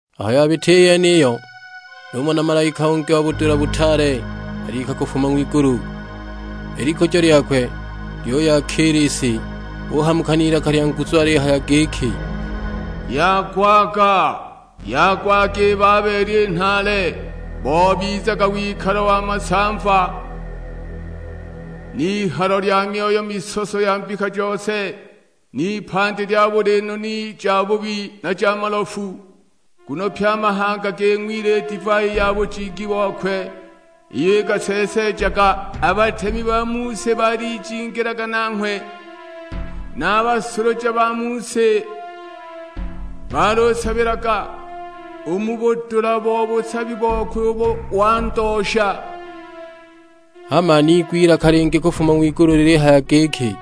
Aho yabita i yeniyo, numona malaika ungi wa budula butaale alika kufuma ng'wigulu; i likujo lyakwe lyuyakiila i si. Uhamuka n'ilaka lya nguzu alihaya giki, "Yagwaga, yagwaga i Babeli i nhaale. Bobizaga wikalo wa masamva, n'ihalo lya myoyo misoso ya mbika jose, n'ipandi lya buli noni jabubi na ja malofu. Nguno pye a mahanga ging'wile i divai ya bujingi bokwe, iyo ikaseeseejaga. A batemi ba mu si baalijingilaga nanghwe, na a basuluja ba mu si balusabilaga u mu budula bo busabi bokwe ubo wandoosha!" Hama niigwa ilaka lingi kufuma ng'wigulu lilihaya giki,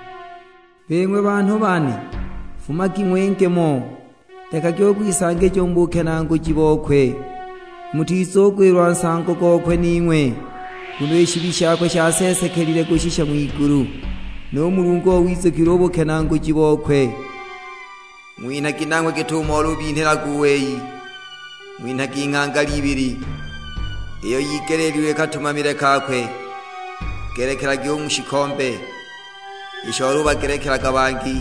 "Bing'we banhu bane, fumagi ng'winge mo, lekagi u kwisangija u mu bukenaaguji bokwe, mutizugwilwa nsango gokwe ning'we. Nguno i shibi shakwe shaseesekelile kushisha ng'wigulu; nu Mulungu owizukilwe u bukenaaguji bokwe. Ng'winhagi nanghwe git'umo olubinhilaga u wei, ng'winhagi nghangala ibili iyo yigeleelilwe katumamile kakwe. Ngelekelagi u mu shikombe isho olubagelekelaga bangi,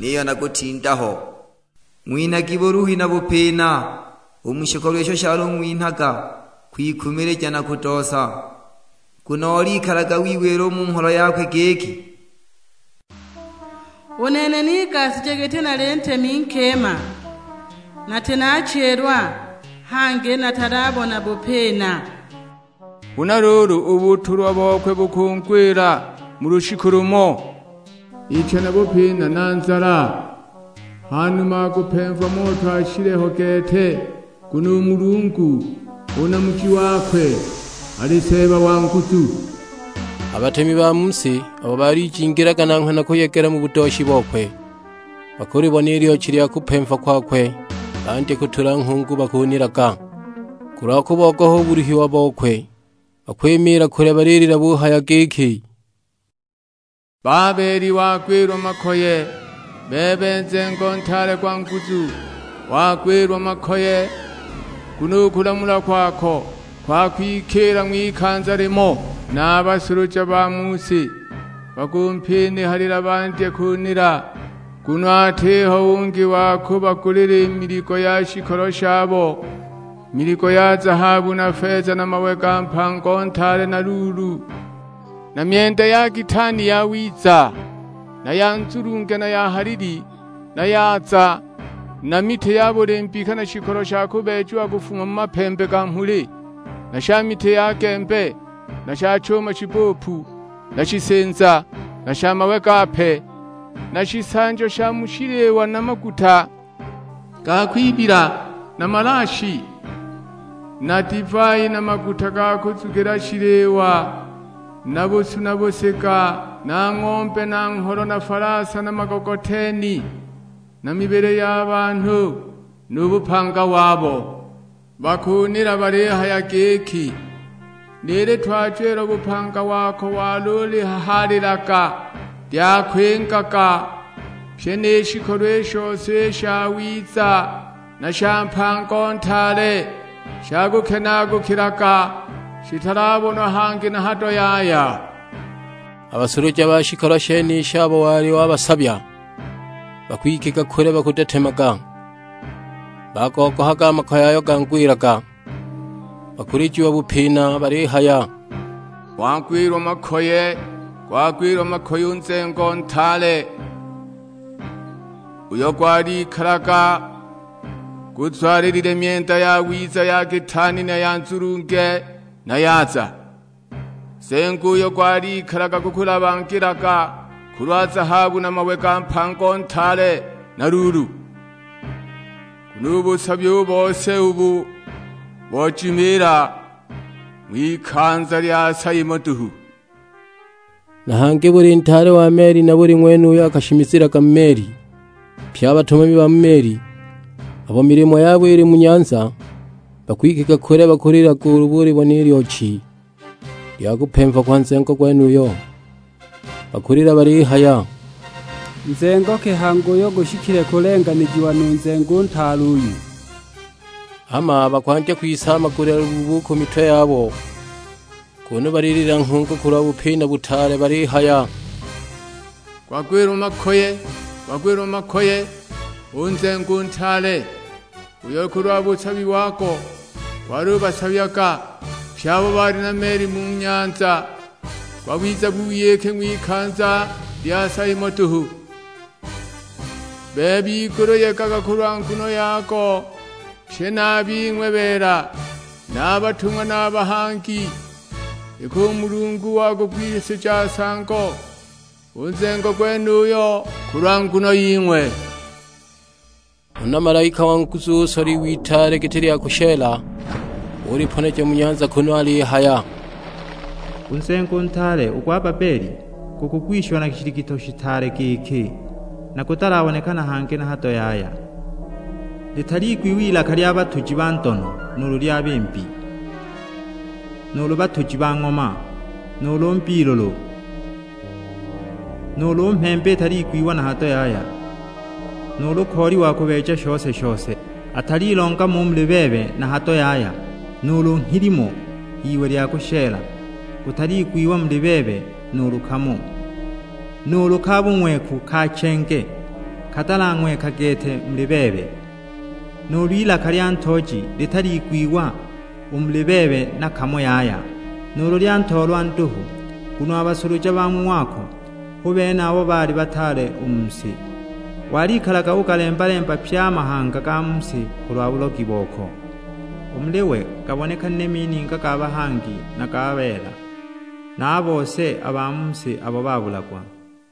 niyo na kutinda ho! Ng'winhagi buluhi na bupina u mu shikolo isho shalung'winhaga kwikumilija na kudoosa. Nguno olikalaga wiwila u mu ngholo yakwe giki, 'U nene nigashije giti nali ntemi nkima, nati naachilwa, hangi natalabona bupina!' Huna luulu, u butulwa bokwe bukungwila mu lushiku lumo: icha na bupina na nzala. Hanuma akupemva moto ashile ho gete; nguno u Mulungu, u Namuji wakwe, ali Seeba wa nguzu. "A batemi ba mu si abo baalijingilaga nanghwe na kuyegela mu budooshi bokwe, bakulibona i lyochi lya kupemva kwakwe bandye kutula nghungu bakunilaga. Kulwa kubogoha u buluhiwa bokwe, bakwimiila kule balilila buhaya giki, 'Babeli wagwilwa makoye, bebe nzengo ntaale gwa nguzu, wagwilwa makoye. Nguno u kulamulwa kwako gwakwikiila ng'wikanza limo!' "Na a basuluja ba mu si bakumpinihalila bandye kunila, nguno atiho ungi wa kubagulila i miligo ya shikolo shabo; miligo ya zahabu na feza na mawe ga mpango ntaale na luulu, na myenda ya kitaani yawiza, na ya nzulunge na ya halili, na yaza; na miti ya buli mbika na shikolo sha kubeejiwa kufuma mu mapembe ga mhuli, na sha miti ya gembe, na sha chuma shibbupu, na shisinza, na sha mawe gape; na shisanjo sha mu shiliwa na maguta ga kwibila, na malaashi, na divai na maguta ga kuzugila shiliwa, na busu na busiga, na ng'ombe na ngholo na falasa na magogoteni, na mibili ya banhu, nu bupanga wabo! Bakunila balihaya giki, 'Ni litwajo ilo bupanga wako walulihahaalilaga lyakwingaga; pyi ni shikolo i shose i shawiza na sha mpango ntaale shakukenaagukilaga, shitalabonwa hangi na hado yaya!' A basuluja ba shikolo shenishi abo wali wabasabya, bakwikiga kule bakudetemaga, bagogohaga a makoye ayo gangwilaga. Bakulijiwa bupina balihaya, 'Gwagwilwa makoye, gwagwilwa makoye u nzengo ntaale, uyo gwalikalaga guzwalilile myenda yawiza ya kitaani na ya nzulunge, na yaza. Nzengo uyo gwalikalaga gukulabagilaga kulwa zahabu na mawe ga mpango ntaale, na luulu! Nguno u busabi u bose ubu bojimiila ng'wikanza lya sa imo duhu!' "Na hangi buli ntaale wa meli na buli ng'wene uyo akashimizilaga mu meli, pye a batumami ba mu meli, abo milimo yabo ili mu nyanza, bakwikiga kule bakulilaga ulu bulibona i lyochi lya kupemva kwa nzengo gwenuyo; bakulila balihaya, 'Nzengo ki hangi uyo gushikile kulenganijiwa nu nzengo u ntaale uyu!' Hama bakwandya kwisaamagulila lubuubu u ku mitwe yabo, kunu balilila nghungu kulwa bupina butaale; balihaya, 'Gwagwilwa makoye, gwagwilwa makoye u nzengo u ntaale, uyo kulwa busabi wago gwalubasabyaga pye abo bali na meli mu nyanza; gwabiza buyiki ng'wikanza lya sa imo duhu!' Bebe igulu yegaga kulwa nguno yago, pye na a bing'we beela, na a batung'wa na a bahangi; iki u Mulungu wagugwisijaga nsango u nzengo gwenuyo, kulwa nguno ying'we!" Huna malaika wa nguzu usola iwe itaale giti lya kushela, uliponeja mu nyanza kunu alihaya, "U nzengo u ntaale, u gwa Babeli gukugwishiwa na shiligityo shitaale giki; na gutalabonekana hangi na hado yaya! Litaliigwiwa ilaka lya batuji ba ndono nuulu lya bimbi, nuulu batuji ba ng'oma, nuulu mbiilulu, nuulu mhembe italiigwiwa na hado yaya; nuulu kooli wa kubeeja shose-shose atalilonga mo u muli bebe na hado yaya, nuulu nghilimo gw'iwe lya kushela gutaliigwiwa u muli bebe nuulu kamo. Nuulu ka bung'weku ka chenge katalang'weka gete u muli bebe; nuulu ilaka lya ntooji litaliigwiwa u muli bebe na kamo yaya, nuulu lya ntoolwa nduhu; nguno a basuluja ba mu ng'wako hu bene abo baali bataale u mu si. Walikalaga ugalemba-lemba pye a mahanga ga mu si kulwa bulogi boko! U muli we gaabonekanile mininga ga bahangi na ga beela, na a bose a ba mu si abo babulagwa!"